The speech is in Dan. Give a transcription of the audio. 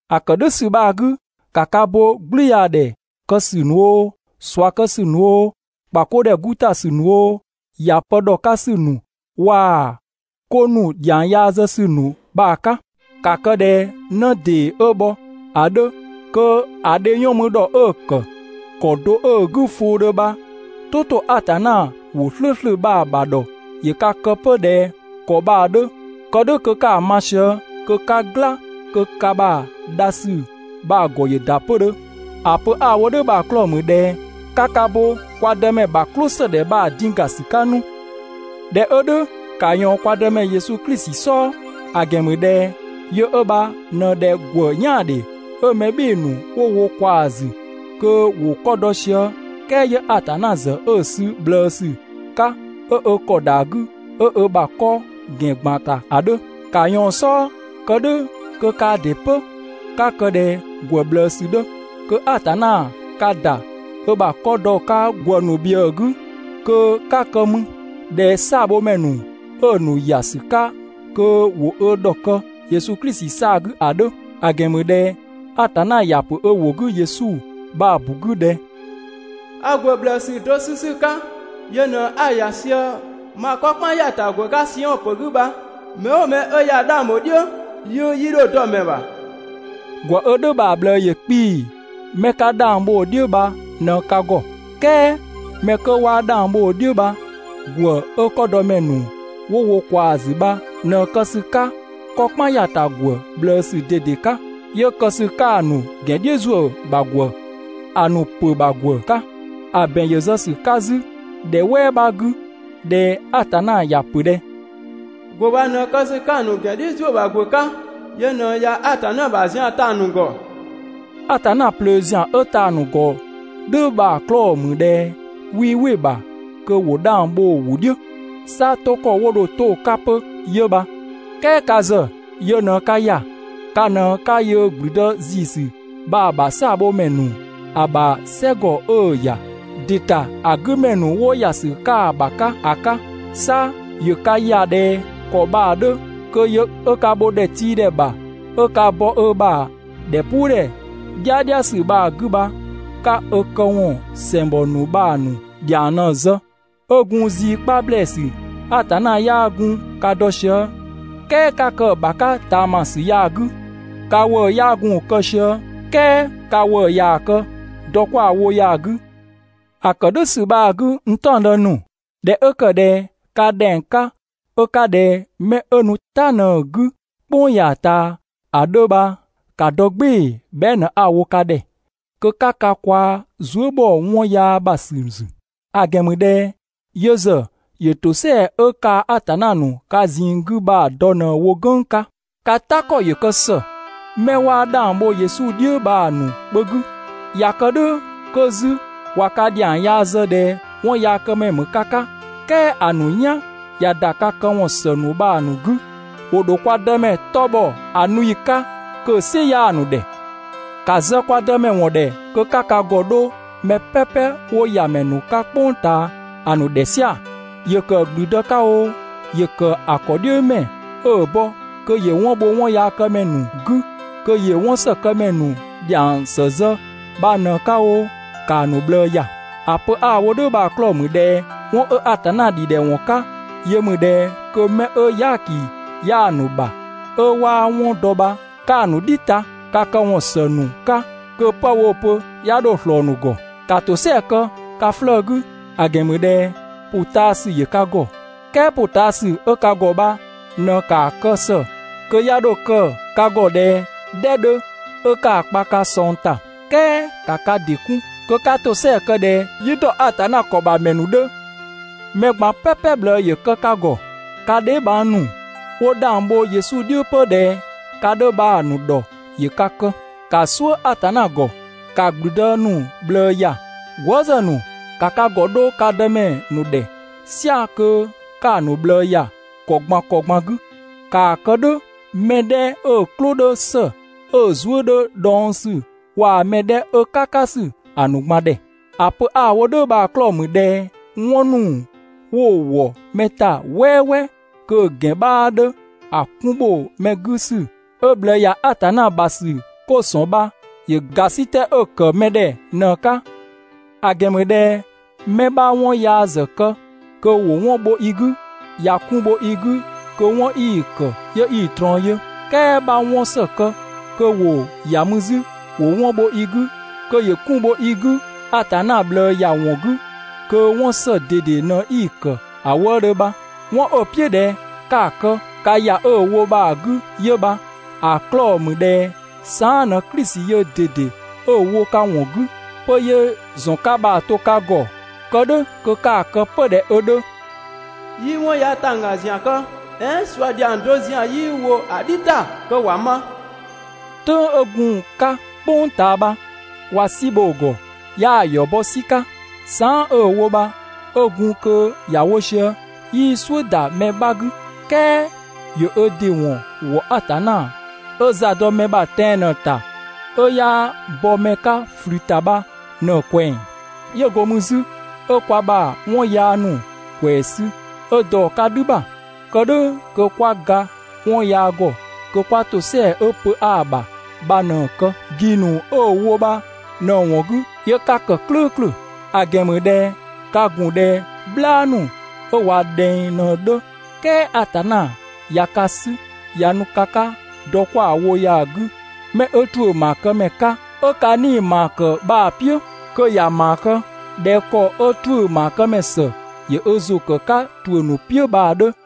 ‑A ‑kë "dhʋ̈ ‑sü bha‑ 'gü, ‑ka ka bo "gblüyaadhɛ kë ‑sü ‑nu oo, ꞊sua kë ‑sü ‑nu oo, ‑kpa 'ko ‑dhɛ 'gu ‑ta ‑sü ‑nu oo, ‑ya pë ‑dhɔ 'ka ‑sü ‑nu waa‑ 'ko ‑nu ‑dhiang yaa zë ‑sü bha‑ 'ka. ‑Ka kë ꞊dhɛ 'në ‑dee 'ö bhɔ ‑a 'dhö kö ‑a dhe 'yɔn mü ‑dhɔ 'dhö‑ ‑kë ‑kɔ do 'ö‑ 'gü fʋʋdhö bha, "tʋ ‑to Atanna ‑wʋ "slʋ̈ʋ̈slʋ̈ bha‑ ‑bha ‑dhɔ ‑yö ka kë 'pö ꞊dhɛ ‑kɔ bha‑ 'dhö, kë "dhʋ̈ kö 'ka‑ ma sië, kö 'ka "gla kö ka ‑bha dha ‑sü bha‑ ‑gɔ ‑yö ‑da 'pödhö. ‑A pö 'a‑ wo "dhʋ̈ bha‑ 'klɔɔ‑ ‑mü ꞊dhɛ 'ka ka bo kwa Dëmɛ ‑bha "klʋsëdhɛ bha‑ din ‑ga ‑sü 'ka 'nu. ꞊Dhɛ 'ö "dhʋ̈, ‑ka ꞊yɔɔn kwa Dëmɛ Yesu Klisi "sɔɔ. ‑A ‑gɛn ‑mü ꞊dhɛ yö 'ö bha ꞊në ꞊dhɛ ‑gwë "yaandhe 'ö mɛ "bhɩɩ‑ ‑nu 'wo wo ꞊kwaa‑ ‑zü kö ‑wo 'kɔ dɔ sië, "kɛɛ 'yö Atanna ‑zë 'ö‑ 'sü ꞊bhlëësü 'ka 'ö ö ‑kɔ ‑da 'gü 'ö ö ‑bha 'kɔ ‑gɛn ‑gban ‑ta ‑a 'dhö. ‑Ka ꞊yɔɔn‑ "sɔɔ kë "dhʋ̈ kö kaa ‑dɩ 'pö 'ka kë ꞊dhɛ ‑gwë ꞊bhlëësü 'dhö, kö Atanna ka ‑da ö ‑bha 'kɔ ‑dɔ 'ka ‑gwë ‑nu ‑bhiëë 'gü kö 'ka kë mü ꞊dhɛ "saabhomɛ ‑nu 'ö‑ ‑nu ‑ya ‑sü 'ka kö ‑wo ö ‑dhɔkë Yesu Klisi 'saa‑ 'gü ‑a 'dhö. ‑A ‑gɛn ‑mü ꞊dhɛ Atanna ‑ya ‑pö ö ‑wʋ 'gü Yesu bha‑ ‑bu 'gü ꞊dhɛ: «A ‑gwë ꞊bhlëësü do 'sü ‑sü 'ka, yö ꞊në 'a‑ ‑ya sië ma 'kɔ "kpan ‑ya ‑ta ‑gwë 'ka Siɔn ‑pö 'gü bha. Mɛ "ʋʋ mɛ 'ö yaa 'dhang ‑bho "dhiʋ̈, 'yiʋ̈‑ 'yii 'dho dɔ‑ ‑mɛ ‑bha.» ‑Gwë 'ö "dhʋ̈ bha‑ ꞊bhlëë ‑yö 'kpii‑ 'mɛ 'ka 'dhang bho‑ "dhiʋ̈ bha ꞊në ka ‑gɔ, "kɛɛ 'mɛ 'kö 'waa 'dhang bho‑ "dhiʋ̈ bha, ‑gwë 'ö 'kɔdɔmɛ ‑nu 'wo wo ꞊kwaa‑ ‑zü bha ꞊në kë ‑sü 'ka 'kɔ "kpan ‑ya 'ka ‑gwë ꞊bhlëësü ꞊dede 'ka, 'yö kë ‑sü 'ka‑ ‑nu ‑gɛn "dhiʋ̈ ‑zuö ‑bha ‑gwë, ‑a ‑nu ‑pö ‑bha ‑gwë 'ka. ‑A ‑bɛn ‑yö zë ‑sü 'ka 'zü ‑dhɛ "wɛɛ 'bha 'gü ꞊dhɛ Atanna ‑ya ‑pö ꞊dhɛ: «‑Gwë bha ꞊në kë ‑sü 'ka ‑a ‑nu ‑gɛn "dhiʋ̈ ‑zuö ‑bha ‑gwë 'ka, yö ꞊në ꞊ya Atanna ‑bha zian ta‑ ‑nu ‑gɔ.» (Atanna ꞊plöö ‑zian 'ö‑ ta‑ ‑nu ‑gɔ "dhʋ̈ bha‑ 'klɔɔ‑ ‑mü ꞊dhɛ) 'wii "wɩ‑ ‑bha kö ‑wo 'dhang bho‑ ‑wʋ "dhiʋ̈. 'Sa 'to ‑kɔ 'wo dho 'to‑ 'ka 'pö 'yö bha. "Kɛɛ ka ‑zë yö ꞊në ka ‑ya, ka ꞊në 'ka yöö ‑gblüdë ‑ziisü bha‑ ‑bha "saabhomɛ ‑nu, ‑a ‑bha "sɛgɔ 'ö‑ ‑ya ‑dɩ ‑ta ‑a 'gü ‑mɛ ‑nu 'wo ‑ya ‑sü 'ka‑ ‑bha 'ka ‑a 'ka. 'Sa ‑yö ka ‑ya ꞊dhɛ ‑kɔ bha‑ 'dhö kö yö 'ö ka bho ‑dhɛtiidhɛ ‑bha 'ö ka bɔ ö ‑bha ‑dhɛpuudhɛ "dhiadhiasü bha‑ 'gü bha 'ka ö këwɔn ‑sɛngbɔ ‑nu bha‑ ‑nu ‑dhiang ꞊në‑ zë. 'Ö gun zii 'kpa ‑blɛɛsü Atanna 'yaa gun ka dɔ sië, "kɛɛ 'ka kë‑ ‑bha 'ka ꞊taamasü ya‑ 'gü. Ka ‑wëë 'yaa gun‑ kë sië, "kɛɛ ka ‑wëë ꞊yaa‑ kë dɔ 'kwa‑ wo ya‑ 'gü. ‑A ‑kë "dhʋ̈ ‑sü bha‑ 'gü, n "taɔngdë ‑nu, ꞊dhɛ 'ö ‑kë ꞊dhɛ ka ‑dhɛng 'ka 'ö 'ka ꞊dhɛ 'mɛ 'ö nu "ta ꞊në‑ 'gü "kpʋng ya‑ ꞊taa ‑a 'dhö bha, ‑ka dɔ "gbɩɩ‑ bhɛa" ꞊në 'a‑ wo ka ‑dhɛ kö 'ka ka kwaa zuë" ‑bhɔ 'wɔn yaa ‑bha ‑sü ‑zü. ‑A ‑gɛn ‑mü ꞊dhɛ yö ‑zë ‑yö ‑tosɛa 'ö kaa‑ Atanna ‑nu ka ꞊zinng 'gü bha‑ dɔ ꞊në‑ wo "gʋ̈ng 'ka. Ka "ta ‑kɔ ‑yö kë ‑së 'mɛ 'waa 'dhang bho Yesu "dhiʋ̈ bha‑ ‑nu kpö 'gü, ꞊ya kë "dhʋ̈ 'kö 'zü ꞊wa ka ‑dhiang yaa zë ꞊dhɛ 'wɔnyaakëmɛ ‑mü ka 'ka, "kɛɛ ‑a ‑nu "yan ꞊ya ‑da ka këwɔn ‑së ‑nu bha‑ ‑nu 'gü, ‑wo ‑dho kwa Dëmɛ 'tɔ bhɔ ‑a nu ‑yi 'ka kö‑ "sɩ 'yaa‑ ‑nu ‑dhɛ. ‑Ka zë kwa Dëmɛ ‑wɔn ‑dhɛ kö 'ka ka ‑gɔ 'dho mɛ "pɛpɛ 'wo ‑yamɛ ‑nu 'ka "kpʋng ꞊taa ‑a ‑nu ‑dhɛ "sia‑. ‑Yö ‑kë ‑gblüdë 'ka oo, ‑yö ‑kë ‑a ‑kɔdhiʋ̈mɛ 'ö‑ bɔ kö ‑yö 'wɔn bho 'wɔnyaakëmɛ ‑nu 'gü, kö ‑yö 'wɔnsëkëmɛ ‑nu ‑dhiang ‑së zë bha ꞊në‑ 'ka oo, ‑kaa ‑nu ꞊bhlëë ‑ya. ‑A pö 'a‑ wo "dhʋ̈ bha‑ 'klɔɔ‑ ‑mü ꞊dhɛ 'wɔn 'ö Atanna ‑dhidhɛwɔn 'ka, yö ‑mü ꞊dhɛ kö 'mɛ 'ö "yaaki 'yaa‑ ‑nu ‑bha 'ö 'waa‑ ‑wɔn dɔ bha 'ka‑ ‑nu "dhi ta ka këwɔn ‑së ‑nu 'ka kö 'pë woo‑ pö 'ya 'dho ꞊slɔɔ‑ ‑nu ‑gɔ. ‑Ka ‑tosɛa kë ka 'flëë‑ 'gü, ‑a ‑gɛn ‑mü ꞊dhɛ ‑pʋtaasü ‑yö ka ‑gɔ. "Kɛɛ ‑pʋtaasü 'ö ka ‑gɔ bha ꞊në ‑kaa kë ‑së kö 'ya 'dho kë ka ‑gɔ "dhɛ 'ka 'ö 'ka‑ kpa ka ꞊sɔng ‑ta. "Kɛɛ ‑ka ka ‑dɩ 'kun, kö 'ka ‑tosɛa kë ꞊dhɛ "yi ‑dɔ Atanna ‑kɔ ‑bha ‑mɛ ‑nu 'dhö. Mɛ ꞊gban "pɛpɛ ꞊bhlëë ‑yö kë ka ‑gɔ. Ka dheebhang ‑nu 'wo 'dhang bho Yesu "dhiʋ̈ 'pö ꞊dhɛ ka 'dhö bha‑ ‑nu ‑dhɔ ‑yö ka kë, ‑ka "suʋ̈ Atanna ‑gɔ, ‑ka ‑gblüdë ‑nu ꞊bhlëë ‑ya. Gwëëzë ‑nu, ‑ka ka ‑gɔ 'dho ka dëmɛ ‑nu ‑dhɛ "sia‑ kö 'ka‑ ‑nu ꞊bhlëë ‑ya ‑kɔ ꞊gban ‑kɔ ꞊gban 'gü. ‑Kaa kë "dhʋ̈ mɛ 'dhɛ 'ö‑ "klʋ 'dhö ‑së 'ö‑ zuë" 'dhö dhɔngsü waa‑ mɛ 'dhɛ 'ö "kakasü ‑a ‑nu ꞊gban ‑dhɛ. ‑A pö 'a‑ wo "dhʋ̈ bha‑ 'klɔɔ‑ ‑mü ꞊dhɛ 'wɔn ‑nu 'wo‑ ‑wɔ mɛ ‑ta "wɛɛwɛɛ kö‑ ‑gɛn 'bhaa 'dhö ‑a 'kun ‑bho mɛ 'gü ‑sü 'ö ꞊bhlëë ‑ya Atanna ‑bha ‑sü 'ko ‑sɔn bha ‑yö ‑gasitɛ 'ö‑ ‑kë mɛ ‑dhɛ ꞊në‑ 'ka. ‑A ‑gɛn ‑mü ꞊dhɛ 'mɛ 'bha 'wɔn yaa ‑zë kë kö ‑wo 'wɔn bho i 'gü, ꞊ya 'kun bho i 'gü kö 'wɔn 'i‑ ‑kë 'yö 'i‑ ꞊trɔɔn yö, "kɛɛ 'bha 'wɔn ‑së kë kö ‑wo ‑ya mü 'zü ‑wo 'wɔn bho i 'gü kö ‑yö 'kun bho i 'gü, Atanna ꞊bhlëë ‑ya ‑wɔn 'gü, kö 'wɔn ‑së ꞊dede ꞊në 'i‑ ‑kë ‑a wëëdhö bha. 'Wɔn 'ö‑ "piʋ̈ ꞊dhɛ 'ka‑ kë ka ‑ya 'ö‑ wo bha‑ 'gü 'yö bha, ‑a 'klɔɔ‑ ‑mü ꞊dhɛ saan" ꞊në Klisi yöö ꞊dede 'ö‑ wo ka ‑wɔn 'gü 'pö 'yö‑ ‑zɔn 'ka bha‑ to ka ‑gɔ kë "dhʋ̈ kö 'ka‑ kë 'pö ꞊dhɛ ö 'dhö. 'Yii 'wɔn yaa ‑tangga ‑zian kë, "ɛɛn ꞊sua ‑dhiang do ‑zian 'yii ‑wo ‑a "dhi ‑ta kö ‑wa ma. "Tʋ̈ng 'ö gun‑ 'ka "kpʋng ꞊taa bha, ꞊wa "si bho‑ ‑gɔ 'yaa‑ ‑yɔ bɔ "si 'ka, saan" 'ö‑ wo bha 'ö gun kö ‑ya wo sië, 'yii "suʋ̈ ‑da mɛ 'bha 'gü, "kɛɛ ‑yö ö ‑dɩ ‑wɔn ‑wɔ Atanna 'ö za dɔ mɛ ‑bha tɛan‑ ꞊në‑ ‑ta 'ö 'yaa bɔ mɛ 'ka ꞊flü ‑ta bha ꞊në‑ ꞊kwɛng. 'Yö go mü 'zü 'ö kwa ‑bha 'wɔn yaa ‑nu ‑kwɛɛ sü 'ö dɔ‑ 'ka "dhü ‑bha, kë "dhʋ̈ kö 'kwa ga 'wɔn yaa ‑gɔ kö 'kwa ‑tosɛa 'ö pö 'aa‑ ‑bha ꞊në‑ kë. ‑Gi ‑nu 'ö‑ wo bha ꞊në‑ ‑wɔn 'gü 'yö 'ka ‑kë "klʋ̈ʋ̈klʋ̈. ‑A ‑gɛn ‑mü ꞊dhɛ ka ‑gun ꞊dhɛ "bhlaa ‑nu 'ö ꞊wa ꞊dhɛng ꞊në‑ 'dhö, "kɛɛ Atanna ꞊ya ka 'sü ꞊ya nu ka 'ka dɔ 'kwa‑ wo ya‑ 'gü 'mɛ 'ö ‑tuʋ̈ ‑maakëmɛ 'ka, 'ö ka 'nii‑ ‑maa kë bha‑ "piʋ̈ (꞊dhɛ ‑kɔ 'ö ‑tuʋ̈ ‑maakëmɛ ‑së ‑yö ö ‑zʋ ‑kë 'ka ‑tuʋ̈ ‑nu "piʋ̈ bha‑ 'dhö).